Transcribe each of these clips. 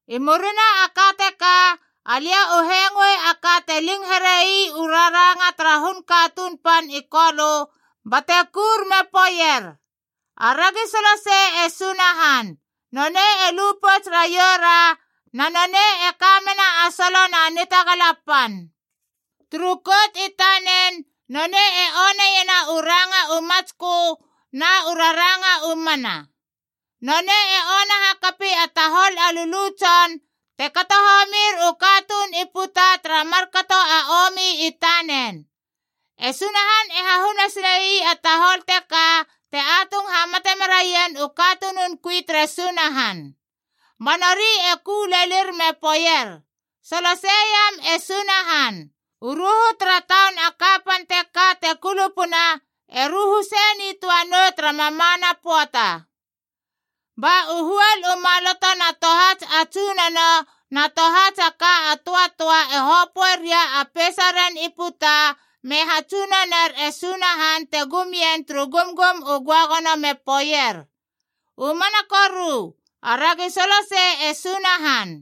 I murina a ka teka alia u hengoei a ka te ling here ii u raranga tara hun katuun pan i Kolö bate kura me poeier: “Aragi solosei e Sunahan! Nonei e lu pouts raioura, na nonei e ka mena a solo na nitagala pan! Turu kout i tanen nonei e oneiena u ranga u matskö na u raranga u mana. Nonei e ona hakapi a tahol a lulu tson te kato homir u katuun i puta tara markato a omi i tanen. E Sunahan e hahuna sile ii a tahol teka te atung hamate meraien u katunun kui tere Sunahan.” Ba nori e ku lelir me poeier: “Soloseiam e Sunahan! U ruhu tara taun a kapan teka te kulupuna e ruhu sei nitöa nou tara mamana pöata!” Ba u huol u maloto na tohats a tsunono na tohats a ka a töatöa e hopöe ria a peisaren i puta me hatsunoner e Sunahan te gum ien turu gumgum u göagono me poeier: “U mana koru! Aragi solosei e Sunahan!”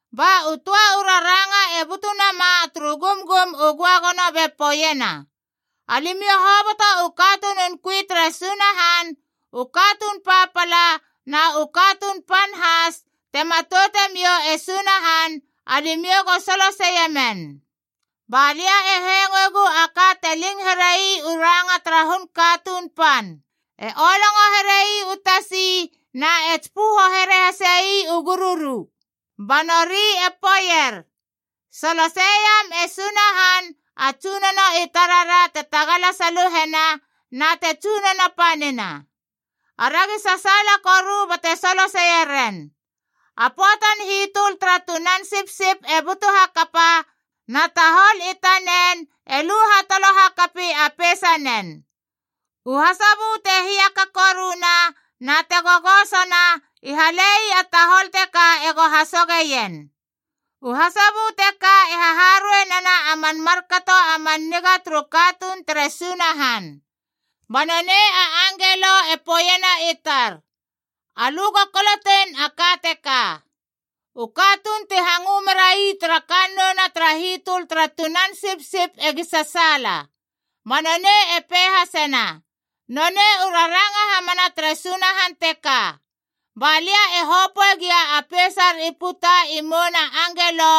Ba u töa u raranga e butu nama turu gumgum u göagono be poeiena: “Alimiou hoboto u katunun kui tere Sunahan, u katuun papala na u katuun pan has te matoute miou e Sunahan, alimiou go soloseie men!” Ba lia e hengoegu a ka te ling here ii u ranga tara hun katuun pan. E olongo here ii u tasi na e tsipöho here hasi u gururu. Ba nori e poeier: “Soloseiem e Sunahan a Tsunono i tarara te tagala saluhena, na te tsunono panina. Aragi sasaala koru bate soloseie ren. A pöatan hitöl tara Tunan Sipsipb e butu hakapa, na tahol i tanenc e lu hatolo hakapi a peisanen. U hasobö te hiaka koruna na te gogosona i hale ii a tahol teka ego hasogeien.” U hasobö teka e haharuei nena a man markato a man niga turu katuun tere Sunahan. Ba nonei a angelo e poeiena i tar, “Alö go kolotein a ka teka: U katuun ti hangö merai tara kannouna tara hitöl tara Tunan Sipsip egi sasaala!” Ba nonei e pei hasena, “Nonei u raranga hamana tere Sunahan teka.” Ba lia e hopöe gia a peisar i puta i mouna angelo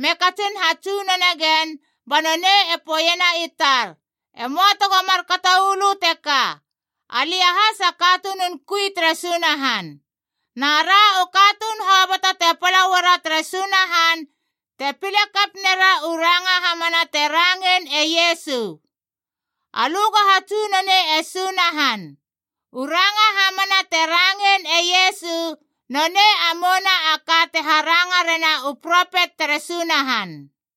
me katsin hatsunone gen, ba nonei e poeiena i tar, “E möa tego markato uu lö teka! Alia has a katunun kui tere Sunahan. Na ra u katuun hoboto te pala uara tere Sunahan te pile kap nera u ranga hamana te rangein e Iesu. Alö go hatsunonei e Sunahan. U ranga hamana te rangein e Iesu nonei a mouna a ka te haranga rena u propet tere Sunahan.”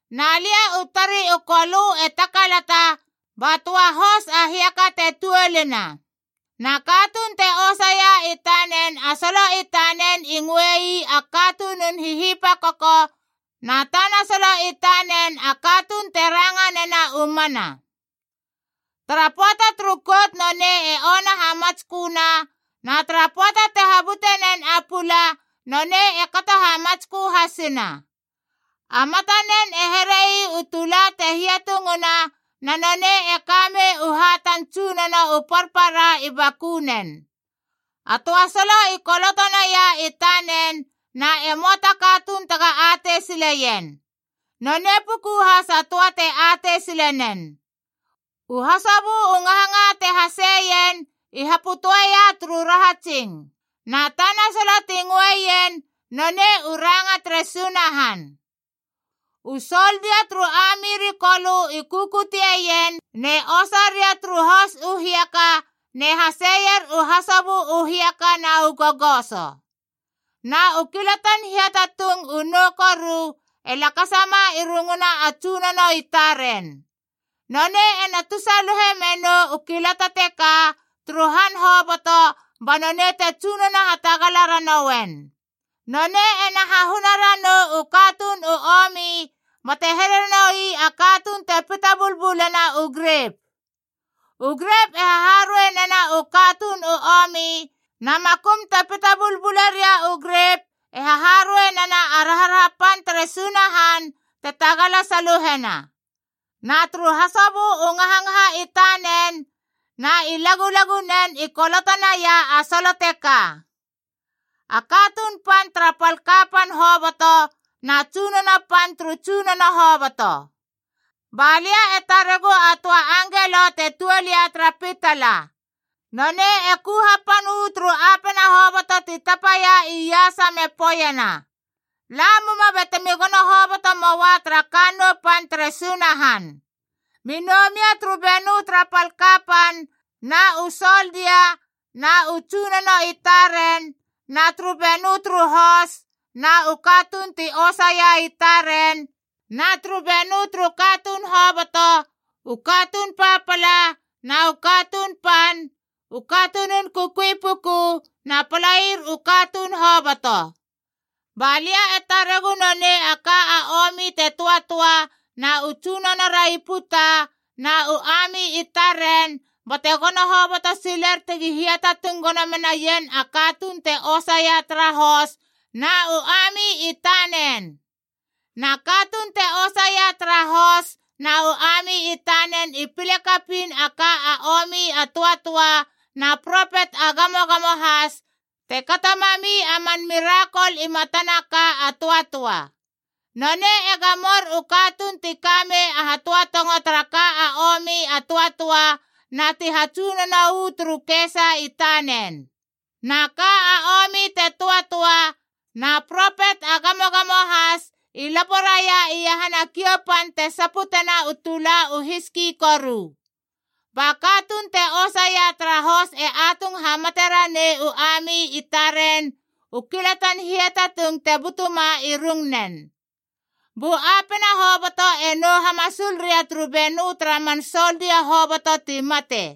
Na lia u tari u Kolö e takalata ba töa hos a hiaka te tuolina. Na katuun te osaia i tanen a solo i tanen i ngöe ii A Katunun Hihipakoko, na tana solo i tanen A Katuun te Ranga nena u Mana. Tara pöata turu kout nonei e ona hamatsköna, na tara pöata te habute nen a pula nonei e kato hamatskö hasina. A matanen e here ii u tula te hiatungna, na nonei e ka mei u hatan tsunono u parpara i bakunen. A töa solo i koloto naia i tanen na e möa ta katuun tega atei sileien. Nonei puku has a töa te atei sile nen. U hasobö u ngahangaha te haseien i hapötöeia turu rahatsing. Na tana solo ti ngöeien nonei U Ranga tere Sunahan. U soldia turu ami ri Kolö i kukuteien ne osa ria turu hos u hiaka ne haseier u hasobö u hiaka na u gogoso. Na u kilatan hiatatung u nou koru e lakasama i runguna a tsunono i taren. Nonei ena tusaluhe menou u kilata teka turu han hoboto ba nonei te tsunono hatagala ranouen. Nonei ena hahuna ranou u katuun u omi bate here noi a katuun te pita bulbulena u grep. U grep e haharuei nena u katuun u omi, na makum te pita bulbule ria u grep e haharuei nena a raharaha pan tere Sunahan te tagala saluhena. Na turu hasobö u ngahangaha i tanen na i lagulagunen i koloto naia a solo teka: A KATUUN PAN TARA PAL KAPAN HOBOTO NA TSUNONO PAN TURU TSUNONO HOBOTO. Balia e taregu a töa angelo te tuol ia tara pitala. Nonei e ku hapan uu turu apena hoboto ti tapaia iasa me poeiena, “La muma batemi gono hoboto moua tara kannou pan tere Sunahan! Mi nou mia turu benö tara pal kapan na u soldia na u tsunono i taren, na turu benö turu hos na u katuun ti osaia i taren, na turu benö turu katuun hoboto, u katuun papala na u katuun pan, u katunun kukui puku na palair u katuun hoboto!” Ba lia e taregu nonei a ka a omi te töatöa na u tsunonora i puta na u ami i taren bate gono hoboto siler tegi hiatatung gono menaien a katuun te osaia tara hos na u ami i tanen.d Na katuun te osaia tara hos na u ami i tanen i pile kapiin a ka a omi a töatöa na propet a gamogamo has te kato mami a man mirakol i matana ka a töatöa. Nonei e gamor u katuun ti ka mei a hatöatongo tara ka a omi a töatöa na ti hatsunono uu turu kesa i tanen. Na ka a omi te töatöa na propet a gamogamo has i lapo raia iahana kiou pan te saputena u tula u hiski koru. Ba katuun te osaia tara hos e atung hamate ranei u ami i taren u kilatan hiatatung te butuma i rungnen. Bu apena hoboto e nou hamasul ria turu benö tara man soldia hoboto ti mate.